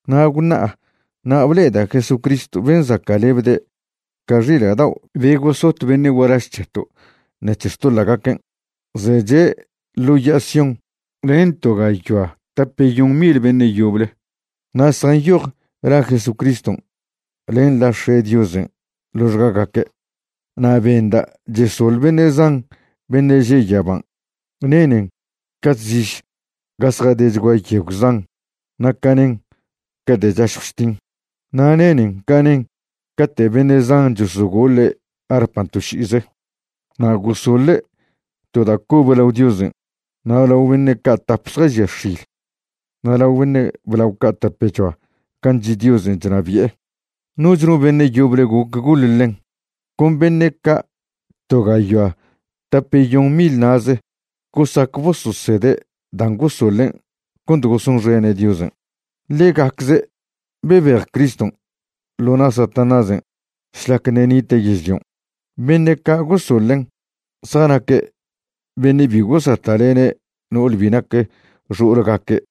Na' gwṉa'a na' ble'eda' Jesucristw ben' zaca'lebde' ca xila' dao' be gosot beṉe' gualaž c̱heto' ṉec̱he xtoḻa'gaquen', zeche' ḻo ya'a Sión len to gayoa tapeyon mil beṉe' yoble. Na' zjanyoj la Jesucriston' len la X̱e' Diosen' ḻoxgagaque'. Na' benda' chesoḻ beṉe' zan beṉe' že' yaban'. Nenen ca chsiž ga zjadechgua yegw zan na' ca nen cate' chašjw chtin. Na' nenen ca nen cate' beṉe' zan chosogoḻe' arpan' to ši'ize. Na' gosoḻe' to da' cobe lao Diosen' na' lao beṉe' ca' tap zjažia x̱il na' lao beṉe' blao ca' tapechoa gan' chi' Diosen' chnabi'e. Noch no beṉe' yoble goc goḻ ḻen, con beṉe' ca' to gayoa tapeyon mil na'ze gosac bososede' dan' gosoḻen' cont gosonxene' Diosen', ḻegacze' bebej Criston' ḻo na' Satanásen' šlac ṉe' nite' yežlion'. Beṉe' ca' gosoḻen' zjanaque' beṉe' bi gosata'lene' no'ol bi nac xo'olgaque',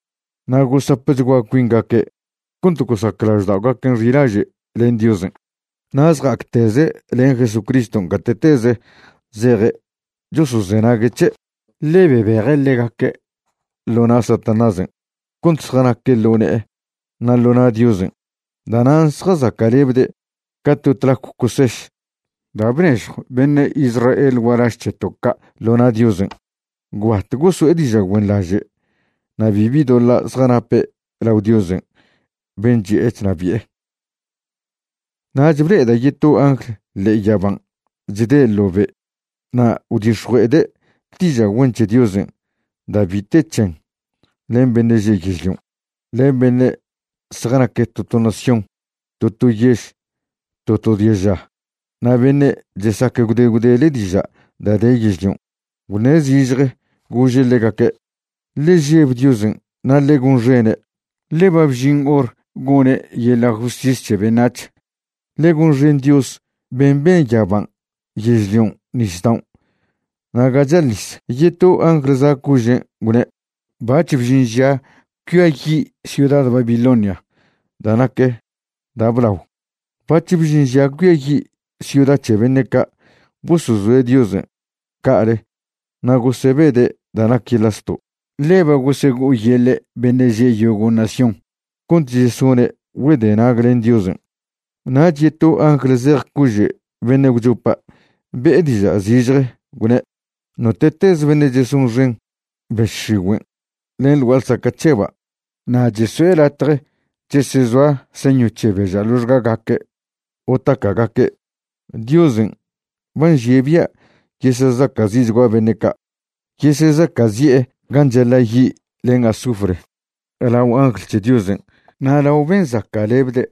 na' gosapchgua cuingaque' cont gosac lažda'ogaquen' xilaže' len Diosen'. Na' zja'acteze' len Jesucriston' gate'teze zeje' chosozenague' c̱he', ḻe bebeje' ḻegaque' ḻo na' Satanásen' cont zjanaque' ḻo ne'e na' ḻo na' Diosen'. Da'nan' zjazaca'lebde' ca to tlacw coseš da' bnežjw beṉe' Israel gualaž c̱heto' ca' ḻo na' Diosen'. Gwbat goso'e diža' güenḻaže' na' bibi doḻa' zjanape' lao Diosen' ben' chi'e chnabi'e. Nach ble'eda' yeto angl ḻe'e yaban' chde' ḻo be'. Na' gwdix̱jue'ede' diža' güen c̱he Diosen' da' bi te c̱hen len beṉe' že' yežlion', len beṉe' zjanac to to nación, to to yež, to to diaža, na' beṉe' chesac gwde gwdele diža' da' de yežlion'. Gwṉe' zižje gože' ḻegaque': ―Ḻe žeb Diosen' na' ḻe gonxene', ḻe ba bžin hor gone' yeḻa' justis c̱he beṉac̱h. Ḻe gonxen Dios ben' ben yaban', yežlion', nisdao' na' ga chal nis. Yeto angl za' cožen' gwne': ―Bac̱h bžin ža cuiayi' ciuda Babilonia da' nac da' blao. Bac̱h bžin ža cuiayi' ciuda c̱he beṉe' ca' bosozoe' Diosen' ca'ale na' gosebede' da' nac yeḻa' zto', ḻe ba gosego'oyeḻe' beṉe' že' yogo' nación cont chesone' güedenag len Diosen'. Nach yeto angl zej cože' beṉe' gwchopa' be'e diža' zižje gwne': ―Note'teze beṉe' chesonxen bež x̱igüen' len ḻ gua'a ḻsaca' c̱heba' na' cheso'e latje chesezoa señw c̱he beža' ḻoxgagaque' o taca'gaque', Diosen' ba nžie' bia' yesesaca'zi'chgua beṉe' ca'. Yesezaca'zi'e gan' chaḻa' yi' len azufre lao angl c̱he Diosen' na' lao ben' zaca'lebde'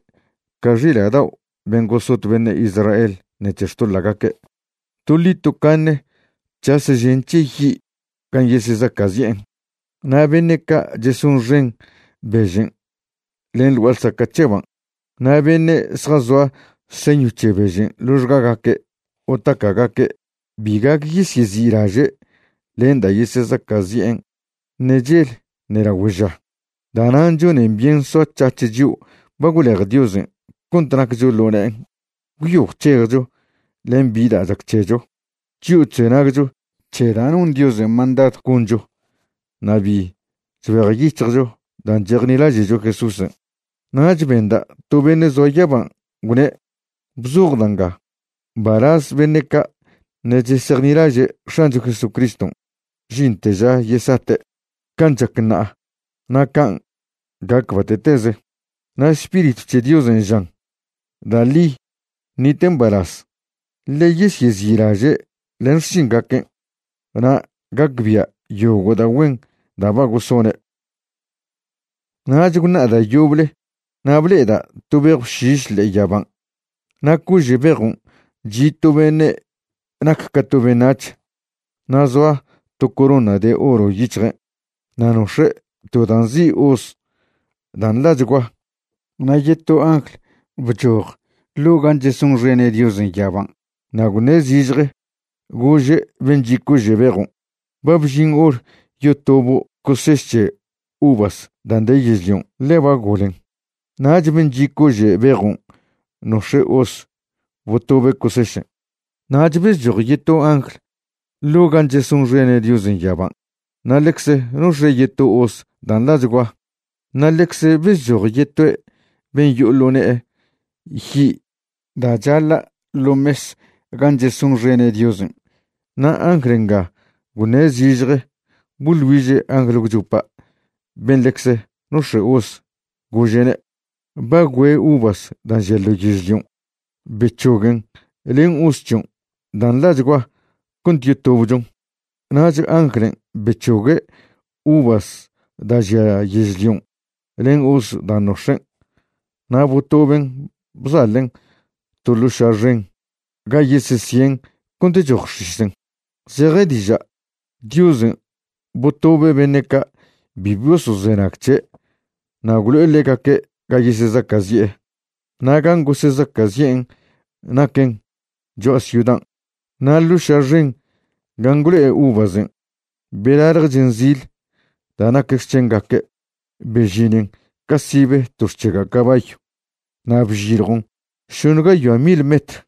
ca xila' dao' ben' gosot beṉe' Israel ṉec̱he xtoḻa'gaque'. Toḻi tocaṉe c̱has žen c̱he yi' gan' yesezaca'zi'en. Na' beṉe' ca' chesonxen bežen' len ḻ gua'a ḻsaca' c̱heban', na' beṉe' zjazoa señw c̱he bežen' ḻoxgagaque' o taca'gaque', bi gac yesyezi'laže' len da' yesezaca'zi'en ṉe chel ṉe lagüe ža. Da'nan' chonen byen soac̱hac̱h chio' ba gwlej Diosen' cont naccho ḻo ne'en, gwyo gwc̱hejcho len bi da' chac c̱hecho, chio' chzenagcho c̱he da' non Diosen' mandadw goncho na' bi chbejyic̱hjcho dan' chejnilaže'cho Jesúsen'. Nach benda' to beṉe' zoa yaban' gwne': ―Bzoj da' nga: “Mbalaz beṉe' ca' ṉe' chesejnilaže' X̱ancho Jesucriston' žinte ža yesate'. Can' chac ṉa'a na' can' gac bate'teze.” Na' Spiritw c̱he Diosen' žan: ―Da' ḻi ṉite' mbalaz, ḻe yesyezi'laže' len xšingaquen', na' gacbia' yogo' da' güen da' ba gosone'. Nach gwṉa'a da' yoble na' ble'eda' to bejw šiš ḻe'e yaban' na' cože' bejon' chi' to beṉe' nac ca to beṉac̱h. Na' zoa to corona de oro yic̱hjen' na' nox̱e' to da' nzi' hoz da' nḻachgua. Na' yeto angl bchoj ḻo' gan' chesonxene' Diosen' yaban' na' gwṉe' zižje gože' ben' chi' cože' bejon': ―Ba bžin hor yotobo' coseš c̱he uvas dan' de yežlion', ḻe ba golen. Nach ben' chi' cože' bejon' nox̱e' hoz botobe' cosešen'. Nach bezchoj yeto angl ḻo' gan' chesonxene' Diosen' yaban' na' ḻecze nox̱e' yeto hoz da' nḻachgua. Na' ḻecze bezchoj yetoe' ben' yo'o ḻo ne'e yi' da' chaḻa' ḻo mes gan' chesonxene' Diosen'. Na' angl nga gwṉe' zižje boḻ güiže' angl gwchopa' ben' ḻecze nox̱e' hoz, gože'ne': ―Ba güe uvas da' žia ḻo yežlion'. Bec̱hoguen len hoz c̱hion' dan' nḻachgua cont yotobchon. Nach anglen' bec̱hogue' uvas da' žia yežlion' len hoz dan' nox̱en' na' botoben' bzaḻen' to ḻo' ša' xen ga yesesien' cont choj x̱isen'. Zeje diža', Diosen' botobe' beṉe' ca' bi bosozenag c̱he' na' gwlo'e ḻegaque' ga yesezaca'zi'e. Na' gan' gosezaca'zi'en naquen cho'a ciudan', na' ḻo' ša' xen gan' gwlo'e uvasen' belalje chen zil da' nac xc̱hengaque', bežinen ca sibe to xc̱hega' cabayw, na' bžiljon šoṉe gayoa mil metr.